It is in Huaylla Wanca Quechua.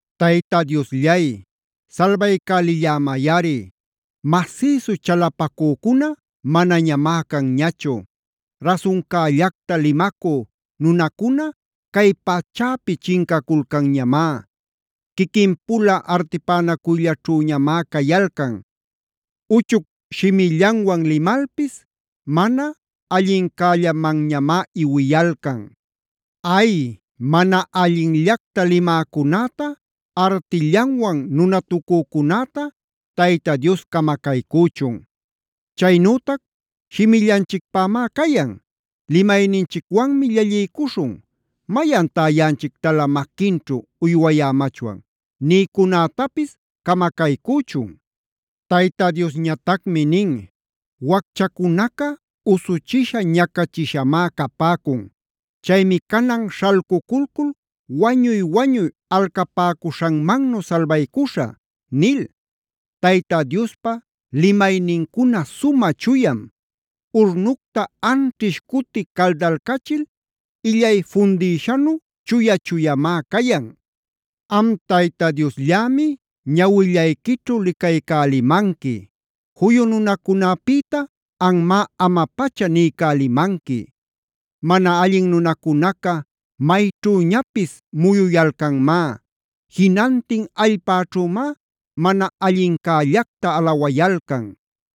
Tayta Diosllay salbaycälillämayꞌari, masïsu chalapacücuna manañamá canñachu.a Rasuncällacta limacü nunacuna cay pachäpi chincaculcanñamá. Quiquin-pula artipänacuyllaćhüñamá cayalcan. Uchuc shimillanwan limalpis mana allincällamanñamá iwiyalcan. Ay, mana allinllacta limäcunäta, artillanwan nunatucücunäta Tayta Dios camacaycüchun. Chaynütac: “Shimillanchicpämá cayan. Limayninchicwanmi llalliycuśhun. ¿Mayantá yaꞌanchictalä maquinćhu uywayämachwan?” nïcunätapis camacaycüchun. Tayta Diosñatacmi nin: “Wacchacunaca usuchisha, ñacachishamá capäcun. Chaymi canan śhalculcul wañuy-wañuy alcapäcuśhanmannu salbaycuśhä” nil. Tayta Diospa limaynincuna sumä chuyam; urnucta anćhish cuti caldalcachil illay fundïshanu chuya-chuyamá cayan. Am Tayta Diosllämi ñawillayquićhu licaycälimanqui; juyu nunacunäpïta anmá ama-pacha niycälimanqui. Mana allin nunacunaca mayćhüñapis muyuyalcanmá. Jinantin allpäćhümá mana allincällacta alawayalcan.